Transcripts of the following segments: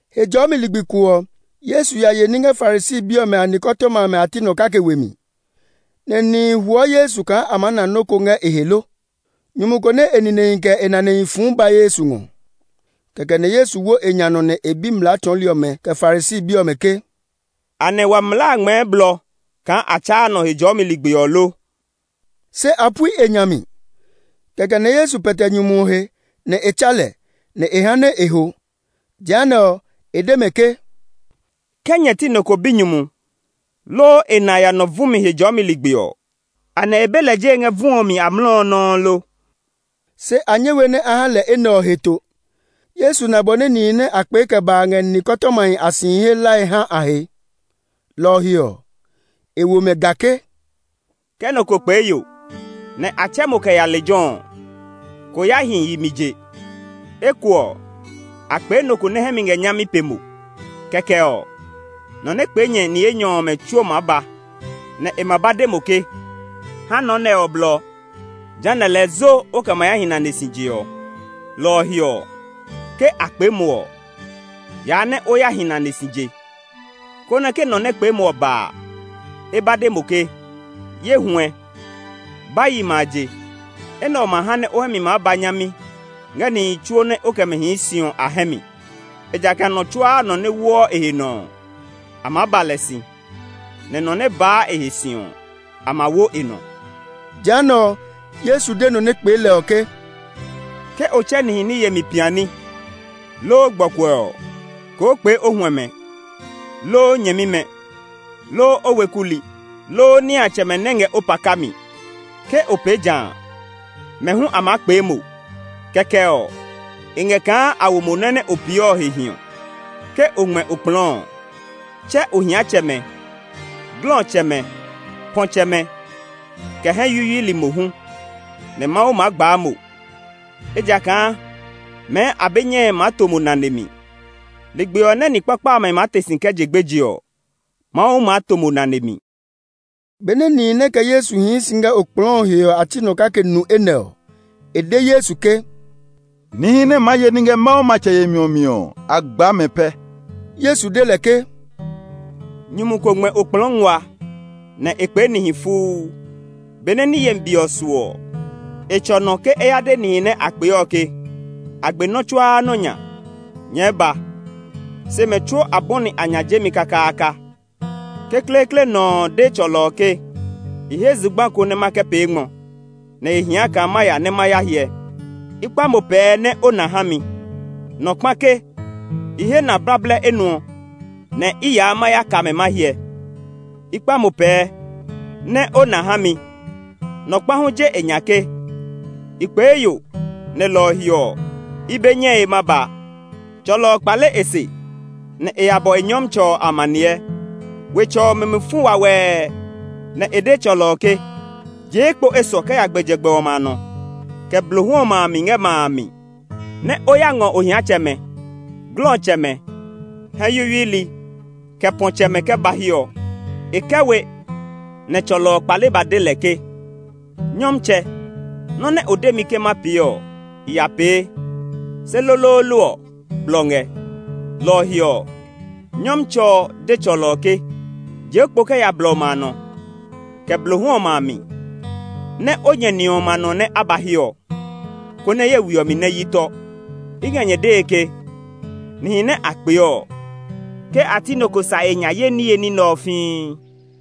Hejɔɔmi ligbi ko ɔ, Yesu ya ye ní ngɛ Farisi bi ɔmɛ a nikɔtɔma amɛ a ti nɔ kake we mi, nɛ nihi huɔ Yesu kaa a maa na nɔ́ ko ngɛ e he lo. Nyumu ko nɛ e ninehi kɛ e nanehi fu ba Yesu ngɔ. Kɛkɛ nɛ Yesu wo e nya nɔ nɛ e bi mlaa tsɔɔli ɔmɛ, kɛ Farisi bi ɔmɛ ke, “Anɛ wa mlaa a ngmɛɛ blɔ kaa a tsa nɔ Hejɔɔmi ligbi ɔ lo?” Se a pui e nya mi. Kɛkɛ nɛ Yesu pɛtɛ nyumu ɔ he, nɛ e tsa lɛ, nɛ e ha nɛ e ho. Jehanɛ ɔ, e de mɛ ke, “Ke nyɛ ti nɔ ko binyumu, loo e na ya nɔ vu mi Hejɔɔmi ligbi ɔ, anɛ e be lɛ jee ngɛ vu ɔ mi amlɔ ɔ nɔuu lo?” Se a nyɛ we nɛ a ha lɛ enɛ ɔ heto. Yesu na bɔ nɛ nihi nɛ a kpee kɛ ba a ngɛ nikɔtɔmahi a sihi he hlae ha a he. Lɔ ɔ he ɔ, e wo mɛ ga ke, “Ke nɔ ko kpee yo, nɛ a tsɛ mo kɛ ya lejɛ ɔ ɔ, ko ya hi yimɛ a je. Eko ɔ, a kpee nɔ ko nɛ hɛ mi ngɛ nyami pe mo. Kɛkɛ ɔ, nɔ nɛ kpee nyɛ ni enyɔ ɔmɛ tsuo maa ba, nɛ e ma ba de mo ke, ‘Ha nɔ nɛ ɔ blɔ.’ Jehanɛ ɔ lɛɛ zo o kɛ ma ya hi nane si je ɔ. Lɔ ɔ he ɔ, ke a kpee mo ɔ, yaa nɛ o ya hi nane si je, konɛ ke nɔ nɛ kpee mo ɔ ba a, e ba de mo ke, ‘Ye huɛ, ba yimɛ a je.’ Enɛ ɔ ma ha nɛ o hɛ mi maa ba nyami ngɛ nihi tsuo nɛ o kɛ mɛ hii si ɔ a hɛ mi. Ejakaa nɔ tsuaa nɔ nɛ woɔ e he nɔ ɔ, a maa ba lɛ si, nɛ nɔ nɛ baa e he si ɔ, a ma wo e nɔ.” Jehanɛ ɔ, Yesu de nɔ nɛ kpee lɛ ɔ ke, “Ke o tsɛ nihi ní yemi piani, loo gbɔkuɛ ɔ, koo kpee o huɛmɛ, loo o nyɛmimɛ, loo o weku li, loo niatsɛmɛ nɛ ngɛ o paka mi. Ke o pee ja a, mɛ hu a maa kpee mo; kɛkɛ ɔ, e ngɛ kaa a wo mo nɔ́ nɛ o pee ɔ he hiɔ. Ke o ngmɛ okplɔɔ ɔ, tsɛ ohiatsɛmɛ, glɔtsɛmɛ, pɔ̃tsɛmɛ, kɛ hɛ yuyuili mohu; nɛ Mawu maa gbaa mo; ejakaa mɛɛ a be nyɛe maa to mo nane mi. Ligbi ɔ nɛ ni kpakpa amɛ maa te si kɛ je gbeje ɔ, Mawu maa to mo nane mi.” Benɛ nihi nɛ kɛ Yesu hii si ngɛ okplɔɔ ɔ he ɔ a ti nɔ kake nu enɛ ɔ, e de Yesu ke, “Nihi nɛ maa ye ní ngɛ Mawu matsɛ yemi ɔ mi ɔ, a gbaa mɛ pɛ!” Yesu de lɛ ke, “Nyumu ko ngmɛ okplɔɔ nguaa, nɛ e kpee nihi fuu. Benɛ ní yemi be ɔ su ɔ, e tsɔ nɔ ke e ya de nihi nɛ a kpee ɔ ke, ‘A gbe nɔ́ tsuaa nɔ́ nya; nyɛɛ ba!’ Se mɛ tsuo a bɔni a nya jemi kakaaka. Kekleekle nɔ ɔ de tsɔlɔ ɔ ke, ‘I he zugba ko nɛ ma kɛ pee ngmɔ, nɛ e hia kaa ma ya nɛ ma ya hyɛ; i kpa mo pɛɛ nɛ o na ha mi!’ Nɔ kpa ke, ‘I he na blablɛ enuɔ, nɛ i yaa ma ya ka mɛ ma hyɛ; i kpa mo pɛɛ nɛ o na ha mi!’ Nɔ kpa hu je e nya ke, ‘I kpee yo, nɛ lɔ ɔ he ɔ, i be nyɛe ma ya.’ Tsɔlɔ ɔ kpale e se, nɛ e ya bɔ e nyɔmtsɛ ɔ amaniɛ. Wetsɛ ɔ mi mi fu wawɛɛ, nɛ e de tsɔlɔ ɔ ke, ‘Jee kpo esɔ kɛ ya gbɛjegbɛ ɔmɛ a nɔ, kɛ blohu ɔmɛ a mi ngɛ ma a mi, nɛ o ya ngɔ ohiatsɛmɛ, glɔtsɛmɛ, hɛ yuyuili, kɛ pɔ̃tsɛmɛ kɛ ba hiɛ ɔ.’ E kɛ we nɛ tsɔlɔ ɔ kpale ba de lɛ ke, ‘Nyɔmtsɛ, nɔ́ nɛ o de mi ke ma pee ɔ, i ya pee; se loloolo ɔ, blɔ ngɛ.’ Lɔ ɔ he ɔ, nyɔmtsɛ ɔ de tsɔlɔ ɔ ke, ‘Jee kpo kɛ ya blɔ ɔmɛ a nɔ, kɛ blohu ɔmɛ a mi, nɛ o nyɛ ni ɔmɛ a nɔ nɛ a ba hiɛ ɔ, konɛ ye we ɔ mi nɛ hyi tɔ. I ngɛ nyɛ dee ke, nihi nɛ a kpee ɔ, ke a ti nɔ ko sa e nya ye niye ní nɛ ɔ fii!’”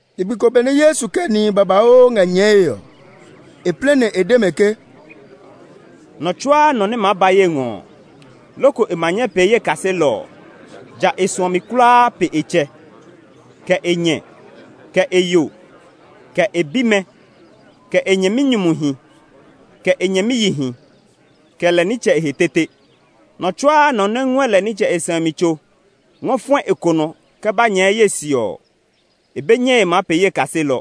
Ligbi ko benɛ Yesu kɛ nihi babauu ngɛ nyɛɛe ɔ, e plɛ nɛ e de mɛ ke, “Nɔ tsuaa nɔ nɛ maa ba ye ngɔ ɔ, loko e ma nyɛ maa pee ye kaselɔ ɔ, ja e suɔ mi kulaa pe e tsɛ, kɛ e nyɛ, kɛ e yo, kɛ e bimɛ, kɛ e nyɛminyumuhi, kɛ e nyɛmiyihi, kɛ lɛ nitsɛ e he tete. Nɔ tsuaa nɔ nɛ ngɔɛ lɛ nitsɛ e sɛumi tso ngɔ fɔɛ e konɔ kɛ ba nyɛɛ ye se ɔ, e be nyɛe maa pee ye kaselɔ.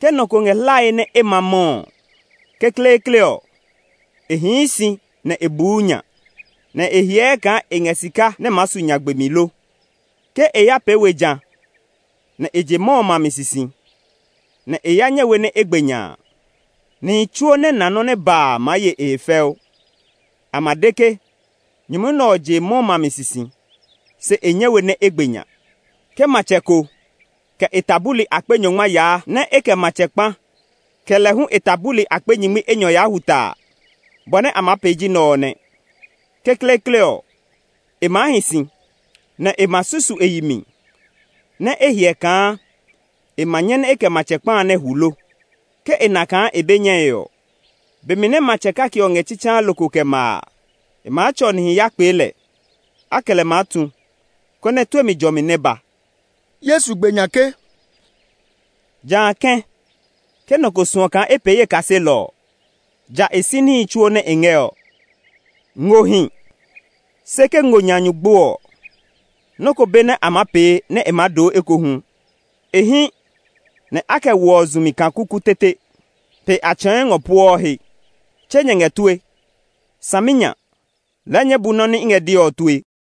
“Ke nɔ ko ngɛ hlae nɛ e ma mɔ ɔ, kekleekle ɔ, e hii si nɛ e buu nya, nɛ e hyɛɛ kaa e ngɛ sika nɛ maa su nya gbemi lo. Ke e ya pee we ja, nɛ e je mɔ ɔ mami sisi, nɛ e ya nyɛ we nɛ e gbe nya a, nihi tsuo nɛ na nɔ́ nɛ ba a maa ye e he fɛu. A ma de ke, ‘Nyumu nɛ ɔ je mɔ mami sisi, se e nyɛ we nɛ e gbe nya.’ “Ke matsɛ ko, kɛ e ta buli akpe nyɔngma yaa nɛ e kɛ matsɛ kpa, kɛ lɛ hu e ta buli akpe nyingmi enyɔ ya hwu ta a, bɔ nɛ e maa pee ji nɛ ɔ nɛ. Kekleekle ɔ, e maa hi si, nɛ e ma susu e yi mi nɛ e hyɛ kaa e ma nyɛ nɛ e kɛ matsɛ kpa a nɛ hwu lo. Ke e na kaa e be nyɛe ɔ, be mi nɛ matsɛ kake ɔ ngɛ tsitsaa lokoo kɛ ma a, e maa tsɔ nihi ya kpee lɛ. A kɛ lɛ maa sɛɛ ní, konɛ tue mi jɔmi nɛ ba.” Yesu gbe nya ke, “Jã kɛ̃, ke nɔ ko suɔ kaa e pee ye kaselɔ ɔ, ja e si níhi tsuo nɛ e ngɛ ɔ. “Ngo hi, se ke ngo nya nyu gbo ɔ, nɔ́ ko be nɛ a maa pee nɛ e doo ekohu. E hí nɛ a kɛ woɔ zu mi kaa kuku tete; pe a tsɛ̃ɛ̃ ngɔ pueɔ he. Tse nyɛ ngɛ tue! Saminya! Lɛɛ nyɛɛ bu nɔ́ nɛ i ngɛ dee ɔ tue!”